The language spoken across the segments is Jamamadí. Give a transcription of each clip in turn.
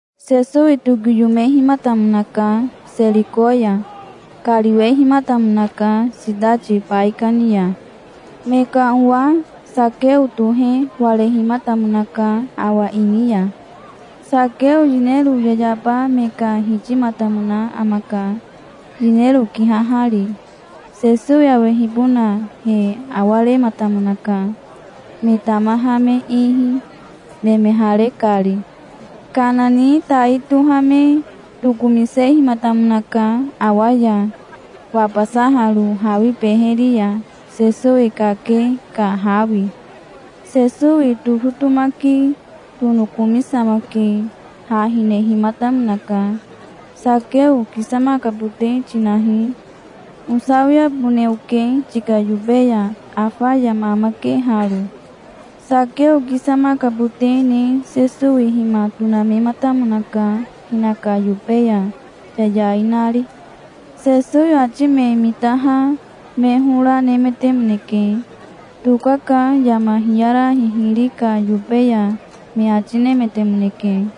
Sesowi tokiyomehimatamonaka Seriko ya. Kariwehimatamonaka sitati baikani ya. Me ka owa Sakeo tohe warehimatamonaka awa ini ya. Sakeo yinero yayaba me ka hitimatamona amaka, yinero kihahari. Sesowi awehibona he awarematamonaka, me tamaha me ihi, nemehare kari. Kana ni tai tohame tokomisehimatamonaka awa ya, wabasaharo hawi beheri ya, Sesowi kake ka hawi. Sesowi tofotomaki tonokomisamake ha hinehimatamonaka. "Sakeo kisamakabote tinahi. Osawiabone oke tika yobe ya. Afa yama amake haro". Sakeo kisamakabote ne Sesowi hima tonamematamonaka hinaka yobe ya, yayai nari. Sesowi ati me mitaha me hora nemetemoneke. "Tokaka yama hiyara hihiri ka yobe ya", me ati nemetemoneke.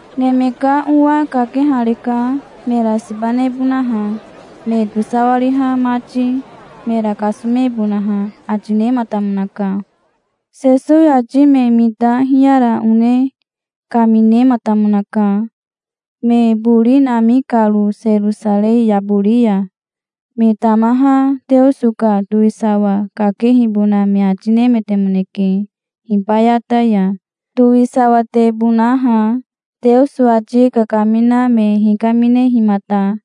Neme ka Owa kakehareka mera siba nebonaha, me tosawariha mati, mera kasomebonaha", ati nematamonaka. Sesowi ati me mita hiyara one kaminematamonaka, me bori nami karo Serosarei yabori ya. Me tamaha Teoso ka towisawa kakehibona me ati nemetemoneke hibayata ya, towisawatebonaha, Teoso ati kakamina me hikaminehimata.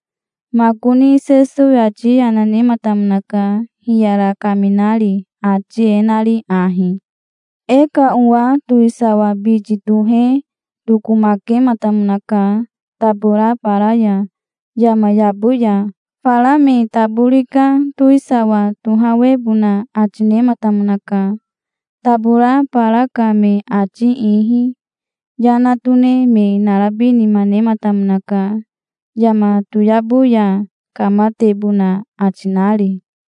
Makoni Sesowi ati yana nematamonaka, hiyara kaminari, ati e nari ahi: "E ka owa towisawa biti tohe tokomakematamonaka tabora bara ya, yama yabo ya. Fara me tabori ka towisawa tohawebona ati nematamonaka, tabora bara ka me ati ihi. Yana tone me narabi nima nematamonaka, yama toyabo ya kamatebona ati nari.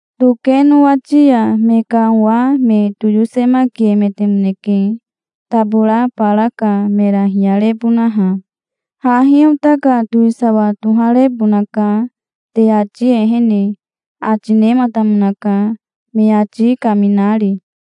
"Toke nowati ya me ka owa me toyosemakiemetemoneke, tabora bara ka mera hiyarebonaha. 'Hahi ota ka towisawa toharebonaka te ati ehene', ati nematamonaka, me ati kaminari".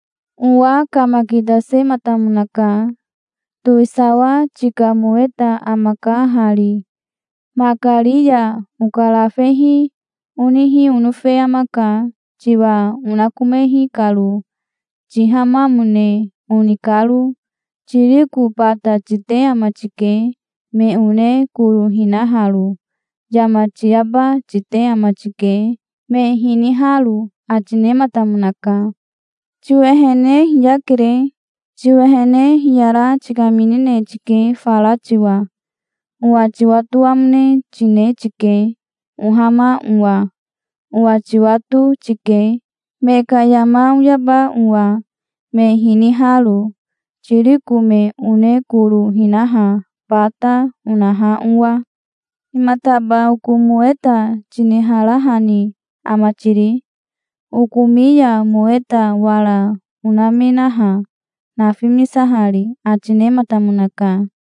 "Owa kamakitasematamonaka. 'Towisawa tika moweta amaka hari. Makari ya okarafehi onihi onofe amaka, tiwa onakomehi karo, tihamamone oni karo. Tiriko bata tite ama tike, me one koro hinaharo. Yama tiyaba tite ama tike, me hiniharo', ati nematamonaka". "'Tiwehene hiyakere. Tiwehene hiyara tikaminine tike fara tiwa. Owa tiwatoamone tine tike, ohama owa. Owa tiwato tike, me ka yama oyaba owa, me hiniharo, tiriko me one koro hinaha bata, onaha owa. Himataba oko moweta tiniharahani ama tiri? Okomi ya moweta wara onamenaha, nafimisahari', ati nematamonaka".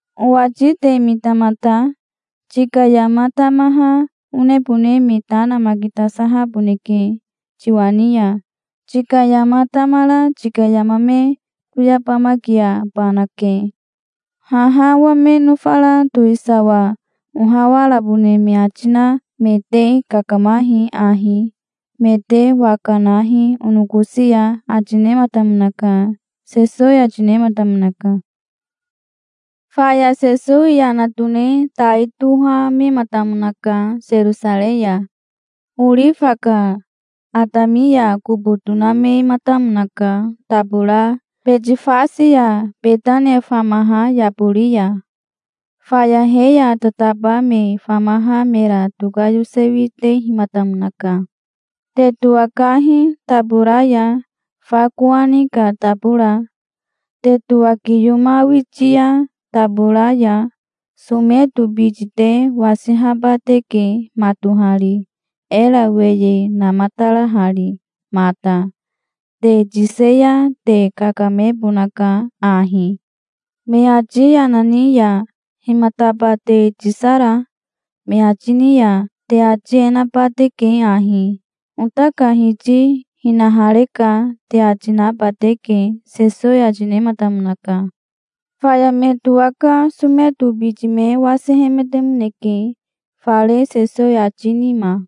"'Owati te mitamata. Tika yama tamaha onebone me ta namakitasahaboneke tiwa ni ya. Tika yama tamara tika yama me toyabamakiabanake. Haha owa me nofara towisawa ohawarabone me ati na me te kakamahi ahi. Me te waka nahi onokosi ya', ati nematamonaka", Sesowi ati nematamonaka. Faya Sesowi yana tone tai tohamematamonaka Serosarei ya. Orifa ka atami ya kobo tonamematamonaka tabora Betifase ya Betania famaha yabori ya. Faya he ya tataba me famaha mera tokayosewitehimatamonaka. "Te towakahi tabora ya, fa kowani ka tabora. Te towakiyomawiti ya tabora ya someto biti te wasihaba teke matohari, era weye namatarahari mata. Te tise ya te kakamebonaka ahi. Me ati yana ni ya 'Himataba te tisara?' me ati ni ya te ati e naba teke ahi: 'Ota ka Hiti hinahareka', te ati naba teke", Sesowi ati nematamonaka. Faya me towaka someto biti me wasihemetemoneke fare Sesowi ati nima.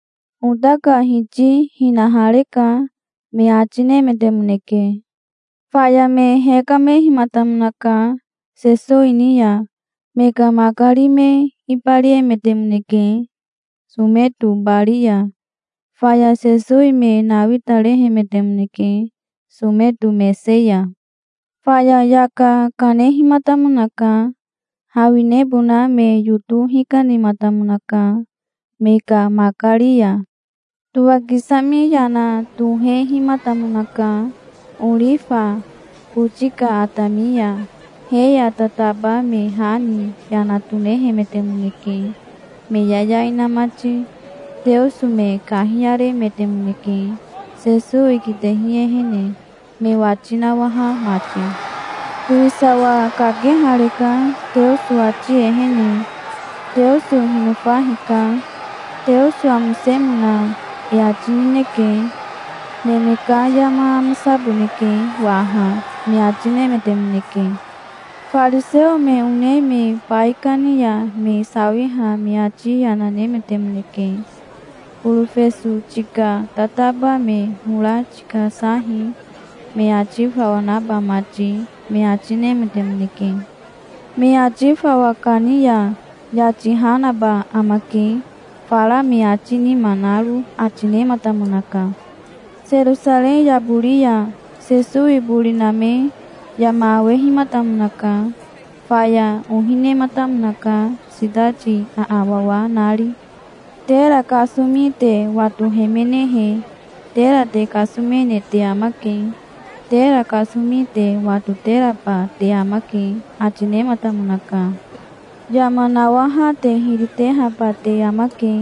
"Ota ka Hiti hinahareka", me ati nemetemoneke. Faya me hekamehimatamonaka Sesowi ni ya. Me ka makari me ibariemetemoneke someto bari ya. Faya Sesowi me nawitarehemetemoneke someto mese ya. Faya yaka kanehimatamonaka. Hawinebona me yoto hikanematamonaka me ka makari ya. Towakisami yana tohehimatamonaka orifa boti ka atami ya. He ya tataba me ha ni yana tonehemetemoneke, me yayai na mati. Teoso me kahiyaremetemoneke, Sesowi kitehi ehene me wati nawaha mati. "Towisawa kakehareka Teoso ati ehene. Teoso hinofa hika. Teoso amosemona e ati nineke. Neme ka yama amosaboneke waha", me ati nemetemoneke. Fariseo me one me baikani ya me sawiha me ati yana nemetemoneke. "Borofeso tika tataba me hora tikasahi, me ati fawa naba mati", me ati nemetemoneke. "Me ati fawa kani ya yati ha naba amake, fara me ati nima naro", ati nematamonaka. Serosarei yabori ya Sesowi bori name yama awehimatamonaka. Faya ohi nematamonaka, sitati aawawa nari. "Tera kasomi te watohemenehe, tera te kasomene te amake. Tera kasomi te watoteraba te amake", ati nematamonaka. "Yama nawaha te hiri tehaba te amake.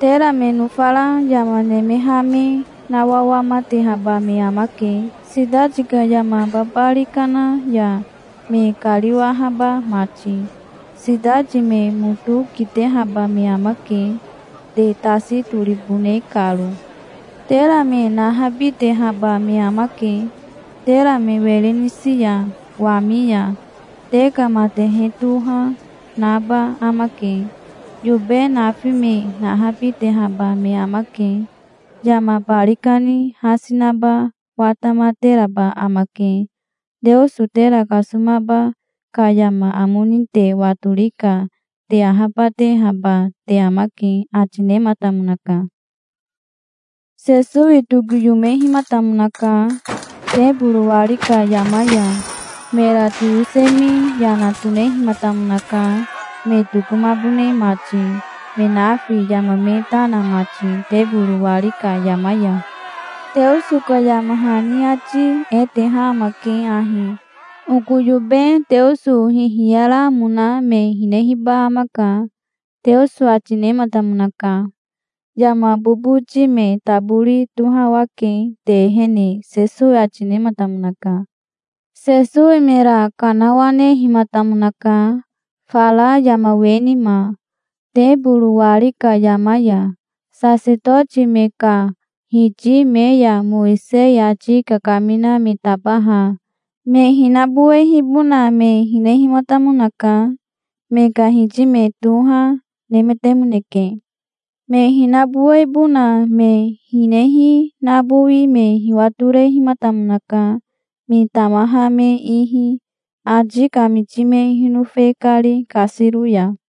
Tera me nofara yama nemeha me nawawamatehaba me amake, sitati ka yama babari kana ya me kariwahaba mati. Sitati me moto kitehaba me amake, te tasi toribone karo. Tera me nahabitehaba me amake, tera me were nisi ya wami ya. Te ka matehe toha naba amake. Yobe nafi me nahabitehaba me amake. Yama bari kani hasi naba watamateraba amake. Teoso tera kasomaba ka yama amo ni te watori ka te ahabatehaba te amake", ati nematamonaka. Sesowi tokiyomehimatamonaka teboro wari ka yama ya. Mera toyosemi yana tonehimatamonaka, me tokomabone mati, me nafi yama me ta na mati teboro wari ka yama ya. "Teoso ka yama hani ati e teha amake ahi: 'Oko yobe Teoso hihiyaramona me hinehiba amaka', Teoso ati nematamonaka. Yama boboti me tabori tohawake te ehene", Sesowi ati nematamonaka. Sesowi mera kanawanehimatamonaka fara yama we nima, teboro wari ka yama ya. Sasetoti me ka hiti me ya Mowisei ati kakamina me tabaha me hinabowehibona me hinehimatamonaka. Me ka hiti me toha, nemetemoneke. Me hinabowebona me hinehi nabowi me hiwatorehimatamonaka, me tamaha me ihi, ati kamiti me hinofe kari kasiro ya.